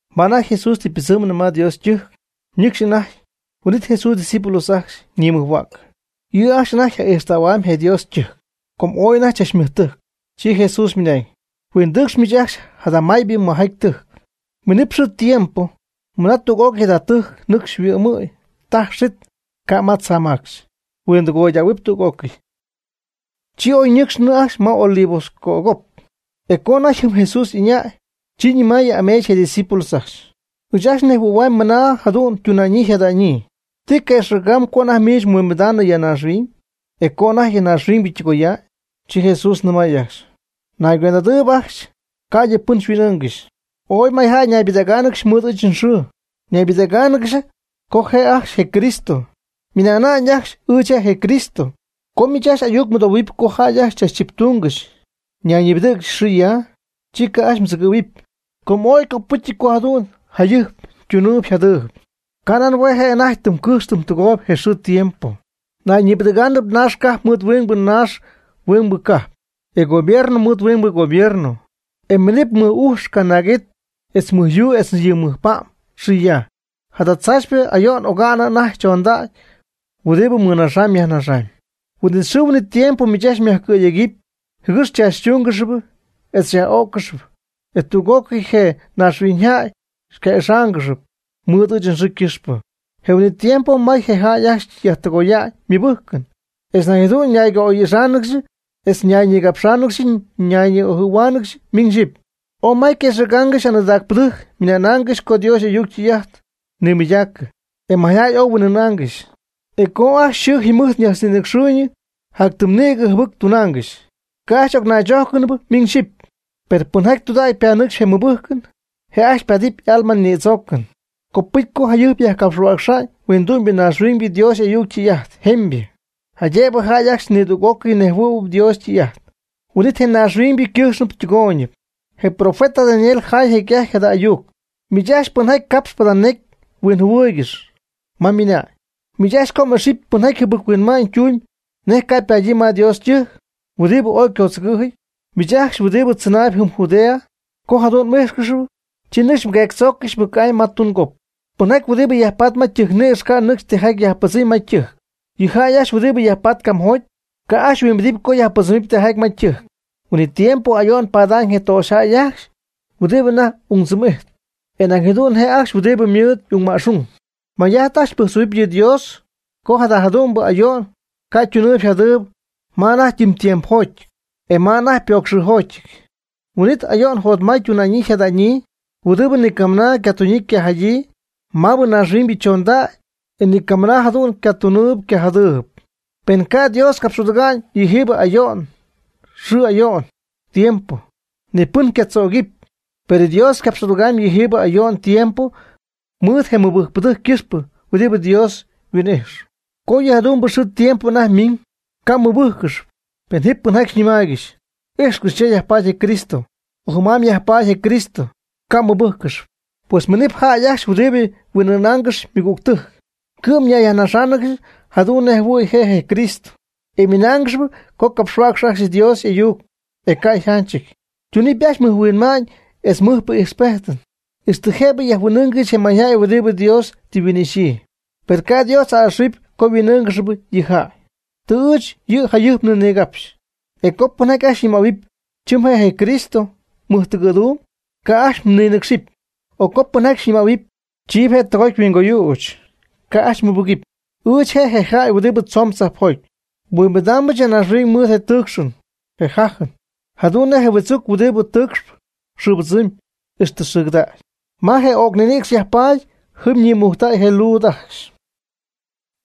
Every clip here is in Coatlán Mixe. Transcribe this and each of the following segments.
Ma anajty Jesús tɨ ypɨdzɨmnɨ ma Dios ytɨjc, nɨcxp anajty, huin'it Jesús ydiscípulos ajcxy ñimɨjhuäcɨ. Yɨ' ajcxy anajty yaj'ixɨydähuamyb je Dios ytɨjc, com ooy anajty chachmɨjtɨjcɨty. Chi Jesús ymɨnañ: ―Huindɨcx miich ajcxy jada maybɨ mɨjjaty ytɨjc. Miinɨpy xɨɨ tiempo mɨna tüg'ócɨy jada tɨjc nɨcxy yhuɨ'my taj xit, ca' ma tzaamacxy. Huindɨgoydähuɨpy tüg'ócɨy. Chi oy ñɨcxnɨ ajcxy ma Olivos cögop. E co anajty jɨm, Jesús y'ɨñäy, chi ñɨmaayɨ ameech je' ydiscípulos ajcxy: ―Ɨɨch ajcxy nejhuɨ̈huamyb mɨna jëdu'n ytuna'ñyii yjada'ñyii. ¿Ti je' quëxɨ̈gamb co anajty miich mhuimbida'ñ ya naaxhuiñ, e co anajty je naaxhuiñybɨ ytɨgoya'ñ? Chi Jesús nɨmay ajcxy: ―Mnaygüend'adɨɨb ajcxy, ca'ydɨ pɨn xyhuin'ɨɨngɨxy. Ooy mayjäy ñaybɨdägáanɨgɨxy mɨɨd ɨɨch nxɨɨ, naybɨdägáanɨgɨxy co je' ajcxy je Cristo, ymɨna'na'ñ ajcxy: “Ɨɨch je' je Cristo.” Co miich ajcxy ayuc mɨdohuɨpy co jäy ajcxy chachtziptungɨxy ñayñibɨdɨ̈gɨgɨxy xɨ ya, chi ca' ajcxy mdzɨgɨ́ɨygɨxɨp, com ooy ycopɨcyɨty co jadu'n jayɨjp ytunɨɨyb yjadɨɨyb. Ca' nan hue' je' anajty tɨm cɨjxp tɨm tɨgooyb je xɨɨ je tiempo. Nayñibɨdɨ̈gɨɨb naax cajp mɨɨd huɨngbɨ naax huingbɨ cajp, e gobierno mɨɨd huingbɨ gobierno. E miinɨp mɨc'ujx canaag'it etz mɨj yuu etz mɨj pa'm xɨ ya. Jada tzaachypɨ ayo'n oga'nɨ anajty chondägy huɨdibɨ nmɨnaxaanɨm nyajnaxaanɨm. Huin'it xɨɨ huin'it tiempo miich ajcxy myajcɨ̈yegɨpy, jɨgɨx xychaachytúngɨxɨpy e xyaj'ögɨxɨpy. E tüg'ócɨy je maynaaxhuiñyjäy xyca'ixáangɨxɨpy, mɨɨd ɨɨch nxɨɨ ycɨxpɨ. Je huin'it tiempo may je jäy ajcxy yajtɨgoya'ñ ymɨbɨjcɨn. E nañ jadu'n ñayca'oy'ixáanɨgɨxy etz ñayñigapxáanɨgɨxy ñi'ojɨ̈huáanɨgɨxy miñ xyɨpy. Ooy may quëxɨ̈gaangɨxy aanɨɨdaacpɨdɨjc mɨna'naangɨxy co Dios y'ayuc ytɨy' ajt nimɨydacɨ, e mayjäy oy huin'ɨɨnaangɨxy. E je' co ajcxy xɨɨ jɨmɨjt ñajtznïnɨcxɨɨyñɨ jac tɨm nïgɨ jɨbɨcpɨ tunaangɨxy, ca' ajcxy y'ocnaychójcɨnɨpy miñ xyɨpy. Per pɨnjaty tɨydudägy panɨcxp je mɨbɨjcɨn, je' ajcxy ypaadɨp y'alma nïdzoocɨn. Copɨcy co jayɨjp yajcapxhuäcxa'ñ huindu'ñybɨ naaxhuiñybɨ Dios y'ayuc ytɨy'ajt jemybɨ, jaydëbɨ jäy ajcxy nidüg'ocɨy nejhuɨ̈y Dios ytɨy'ajt. Huin'it je naaxhuiñybɨ ycɨjxnɨ ytɨgooyñɨ. Je profeta Daniel jaay jecy'ajty jada ayuc (miich ajcxy pɨnjaty capx jada necy huinjɨhuɨɨygɨxy) ma mɨnañ: Miich ajcxy co m'ixy pɨnjaty jɨbɨc-huinma'ñ tumb nej ca' ypadyii ma Dios ytɨjc, huɨdibɨ ooy ycodzɨgɨ̈jɨty, chi miich ajcxy huɨdibɨ tzɨnaayb jɨm Judea, co jadu'n m'ijxcɨxy, chi nɨcx mgueectzóocɨxɨpy mɨc'amy ma tungop. Pɨnjaty huɨdibɨ yajpatp ma ytɨjcnïcx ca' nɨcxy tijaty yajpɨdzɨmy ma ytɨjc. Yɨ jäy ajcxy huɨdibɨ yajpatp camjoty, ca' ajcxy huimbidɨpy co yajpɨdzɨmɨpy tijaty ma ytɨjc. Huin'it tiempo ayo'n ypadamy je töxyjäy ajcxy huɨdibɨ anajty y'ungdzɨm'ijt, e nañ jadu'n je' ajcxy huɨdibɨ mɨɨd y'ungma'xung. May'ajt ajcxy mbɨjctzoohuɨpy yɨ Dios co jada jadu'mbɨ ayo'n ca' ytunɨɨyb yjadɨɨyb ma anajty ytɨɨchtiempojɨty, etz ma anajty pocxɨnxɨɨjoty. Huin'it oy ayo'n jotmay ytuna'ñyii yjada'ñyii huɨdibɨ nicamɨna ycatuñyii ycajadyiinɨ mabɨ naaxhuiñybɨ chondägy e nicamɨna jadu'n ycajactunɨɨyb ycajacjadɨɨyb. Pen ca' Dios capx'aduga'ñ yɨjiibɨ ayo'n xɨɨ ayo'n tiempo, ni pɨn ca' chögɨpy. Per Dios ycapx'adugamy yɨjiibɨ ayo'n tiempo mɨɨd je mɨbɨjcpɨdɨjc ycɨxpɨ huɨdibɨ Dios tɨ huin'ixy. Co yɨ jadu'mbɨ xɨɨ tiempo anajty ymiiñ, ca' mmɨbɨ́jccɨxɨpy, pen ji pɨnjaty xyñɨmaaygɨxy: “Ijxcɨx, cha yajpaady je Cristo”, o “Jɨm'amy yajpaady je Cristo.” Ca' mmɨbɨ́jccɨxɨpy. Pues miinɨp jäy ajcxy huɨdibɨ huin'ɨɨnaangɨxy ymɨgügtɨjc. Cɨ'm ñayyajnaxáanɨgɨxy jadu'n nej jɨhuɨ̈y je' yCrístɨty, e ymɨnáangɨxɨpy co capxhuäcxy ajcxy Dios y'ayuc, e ca' yjánchɨty. Ytunɨp ajcxy mɨjhuinma'ñ etz mɨjpɨ ijxpejt, ixtɨ jëbɨ jahuin'ɨ́ɨngɨxɨp je mayjäy huɨdibɨ Dios tɨ yhuin'ixyii. Per ca' Dios a'ɨxɨ̈huɨpy co yhuin'ɨɨnɨɨyb yɨ' yjäy. Tɨ ɨɨch yɨ' jayɨjpnɨ nigapxɨch. E co pɨnjaty ajcxy xyñɨmähuɨpy: “Chɨm je' je Cristo mɨjtɨgɨ̈dumb”, ca' ajcxy mninɨcxɨp. O co pɨnjaty ajcxy xyñɨmähuɨpy: “Chiiby je' tɨgoty yhuingoyüch”, ca' ajcxy mmɨbɨgɨpy. Ɨɨch je' je jäy huɨdibɨ tzoon tzajpjoty, nhuimbidaambɨch ya naaxhuiñ mɨɨd je tɨɨcxɨn je jájɨn, jadu'n nej je huɨdzuc huɨdi tɨɨcxp xɨɨbɨdzɨmyb ixtɨ xɨɨgɨdägy. Ma je öcp ninïcx yajpaady jɨm ñïmujctähua'ñ je luud ajcxy.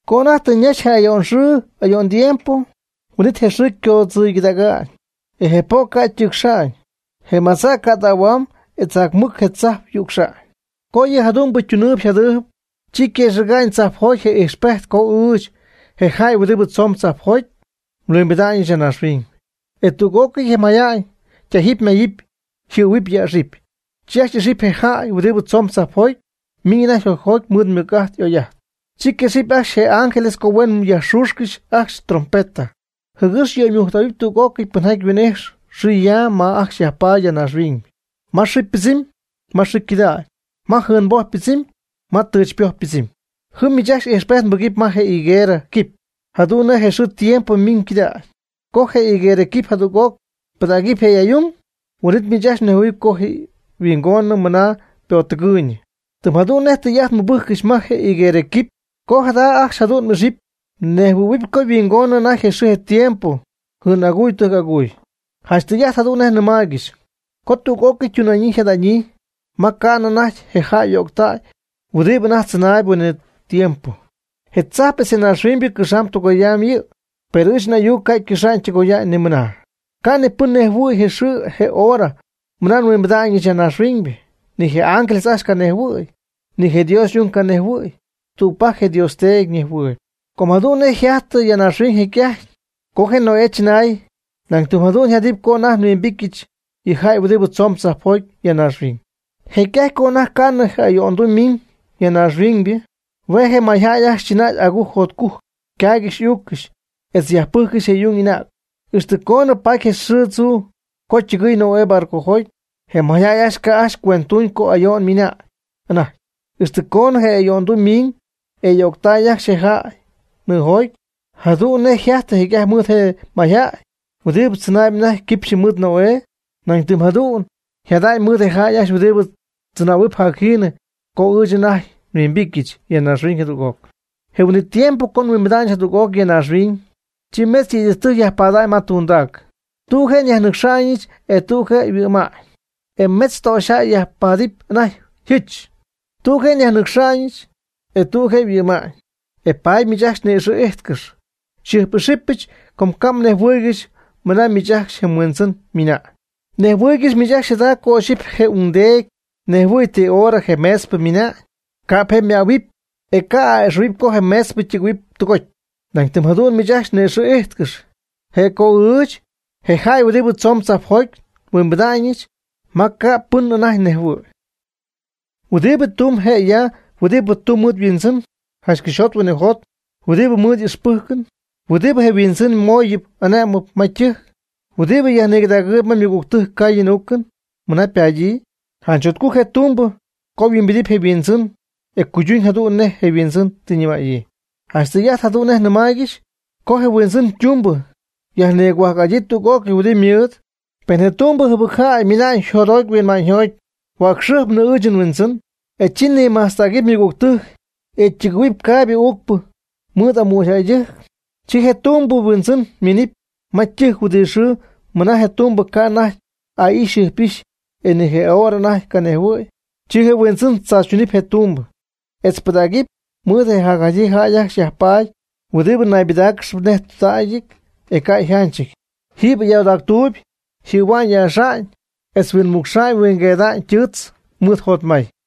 Co anajty tɨ ñaxy je ayo'n xɨɨ ayo'n tiempo, huin'it je xɨɨ ycoodzɨygɨdäga'ñ, je po' ca' ytɨɨcxa'ñ, je madza' ycädähua'ñ etz janch mɨc je tzajp yücxa'ñ. Co yɨ jadu'mbɨ ytunɨɨyb yjadɨɨyb, chi quëxɨ̈ga'ñ tzajpjoty je ijxpejt co ɨɨch, je jäy huɨdibɨ tzoon tzajpjoty, nhuimbida'ñɨch ya naaxhuiñ. E chi tüg'ócɨy je mayjäy tájɨp máyɨp yjɨhuɨ̈huɨpy yäxɨpy, chi ajcxy ixɨpy je jäy huɨdi tzoon tzajpjoty miñ anajty jocjoty mɨɨd ymɨc'ajt y'oy'ajt. Chi nguexɨpyɨch ángeles ajcxy co huen mɨc yajxüxy ajcxy ytrompeta, jɨgɨx yöymujctähuɨpy tüg'ócɨy pɨnjaty huin'ijxyp xɨ ya ma ajcxy yajpaady ya naaxhuiñ; ma xɨɨ pɨdzɨmyb, ma xɨɨ cɨdägy, ma jɨɨnboj pɨdzɨmyb, ma tɨchpoj pɨdzɨmyb. Jɨm miich ajcxy ijxpejt mbɨgɨpy ma je higuerɨ quipy jadu'n nej je xɨɨ tiempo ymiiñ cɨdägy. Co je higuerɨ quipy jadüg'oc pɨdägɨpy je' y'aay'ung, huin'it miich ajcxy nejhuɨ̈huɨpy co yhuingonɨ mɨna ypottɨgɨɨyñɨ. Tɨm jadu'n nej tɨy'ajt mbɨjccɨxy ma je higuerɨ quipy co jada ajcxy jadu'n ixɨpy nejhuɨ̈huɨy co yhuingonɨ anajty je xɨɨ je tiempo jɨɨn'aguy tɨjc'aguy. Janch tɨy'ajt jadu'n nej nɨmaaygɨxy co tüg'ócɨy ytuna'ñyii yjada'ñyii ma ca'nɨ anajty je jäy y'öctäy huɨdibɨ anajty jactzɨnaayb huin'it tiempo. Je tzajp etz je naaxhuiñybɨ cɨxam tɨgoyam yɨ', per ɨɨch n'ayuc ca' ycɨxa'ñ ytɨgoya'ñ nimɨna. Ca' ni pɨn nejhuɨ̈y je xɨɨ je hora mɨna nhuimbida'ñɨch ya naaxhuiñybɨ. Ni je ángeles ajcxy canejhuɨ̈y, ni je Dios y'ung canejhuɨ̈y. Tügpajc je Dios Teedy nejhuɨ̈y. Com jadu'n nej yjajtɨ ya naaxhuiñ jecy'ajty, co je Noé chɨnay, nañ tɨm jadu'n yjadɨpy co anajty nhuimbityɨch, yɨ jäy huɨdibɨ tzoon tzajpjoty, ya naaxhuiñ. Jecy'ajty co anajty ca'nɨ je ayo'nduu ymiiñ ya naaxhuiñybɨ, hue' je' mayjäy ajcxy chɨnay agujc jotcujc, ycaaygɨxy y'uuccɨxy etz yajpɨjccɨxy je y'ung y'anäg, ixtɨ coonɨ paty je xɨɨ tzuu co ytɨgɨɨy Noé barcojoty. Je mayjäy ajcxy ca' ajcxy cuenttuñ co ayo'n miina'ñ anajty, ixtɨ coonɨ je ayo'nduu miin e öctay ajcxy je jäy nɨɨjoty. Jadu'n nej yjajty jecy'ajty mɨɨd je mayjäy huɨdibɨ tzɨnaayb anajty quipxy mɨɨd Noé, nañ tɨm jadu'n yjada'ñ mɨɨd je jäy ajcxy huɨdibɨ tzɨnähuɨp jac jiinɨ co ɨɨch anajty nhuimbityɨch ya naaxhuiñ jadüg'oc. Je huin'it tiempo co nhuimbidɨpyɨch jadüg'oc ya naaxhuiñ, chi metz yëydɨjc yajpaadɨpy ma ytundac, tüg je' yajmɨnɨcxa'ñ, e tüg je' yhuɨ'ma'ñ. E mejtz töxyjäy yajpaadɨp anajty yjɨch, tüg je' yajmɨnɨcxa'ñ, e tüg je' yhuɨ'ma'ñ. E paady miich ajcxy ni'ixɨ̈ íjtcɨx, xyjɨjp'ixɨpyɨch com ca' mnejhuɨɨygɨxy mɨna miich ajcxy je mHuindzɨn ymiina'ñ. Mnejhuɨɨygɨxy miich jada co ixyipy je ungdeedy nejhuɨ̈y ti hora je meetzpɨ miina'ñ, ca'p je' ymähuɨpy, e ca'p a'ɨ'xɨ̈huɨpy co je meetzpɨ ytɨgɨ̈huɨpy tɨgoty. Nañ tɨm jadu'n miich ajcxy ni'ixɨ̈ ijtcɨx, je' co ɨɨch, je jäy huɨdibɨ tzoon tzajpjoty, nhuimbida'ñɨch ma ca' ni pɨn anajty nejhuɨ̈y. ¿Huɨdibɨ tumbɨ je' ya huɨdibɨ tumb mɨɨd yhuindzɨn janch cɨxyjot huinɨjot huɨdibɨ mɨɨd ixpɨjcɨn, huɨdibɨ je' yhuindzɨn mooyɨpy ane'mɨn ma ytɨjc, huɨdibɨ yajnigɨdagɨ̈huɨpy ma ymɨgügtɨjc caayɨn uucɨn mɨna ypadyii? Janch jotcujc je tumbɨ co yhuimbidɨpy je' yhuindzɨn, e je' cuyduñ jadu'n nej je' yhuindzɨn tɨ ñɨmäyii. Janch tɨy'ajt jadu'n nej nɨmaaygɨxy co je huindzɨn ytumbɨ yajnigohuajc'adyii tüg'ócɨy huɨdibɨ ymɨɨd. Pen je tumbɨ jɨbɨcjäybɨ mɨna'ñ jotjoty huinma'ñyjoty: “Huäcxɨjpnɨ ɨɨch je nhuindzɨn.” E chi nïmajtztägɨp ymɨgügtɨjc, e ytɨgɨ̈huɨp caaybɨ uucpɨ mɨɨd amügyjäydɨjc; chi je tumbɨ yhuindzɨn minɨpy ma ytɨjc huɨdi xɨɨ mɨna je tumbɨ ca' anajty aa'ixy jɨjp'ixy e ni je hora anajty canejhuɨ̈y. Chi huindzɨn tzaachytunɨp je' ytumbɨ, etz ypɨdägɨpy mɨɨd je jacjadyii jäy ajcxy yajpaady huɨdibɨ naybɨdáacɨgɨxp nej tudägyjäyɨty e ca' yjanchɨty. Jiiby ayoodactuuby yjɨ̈hua'ñ yäxa'ñ etz huinmucxa'ñ huingueeda'ñ ytɨɨtz mɨɨd jotmay.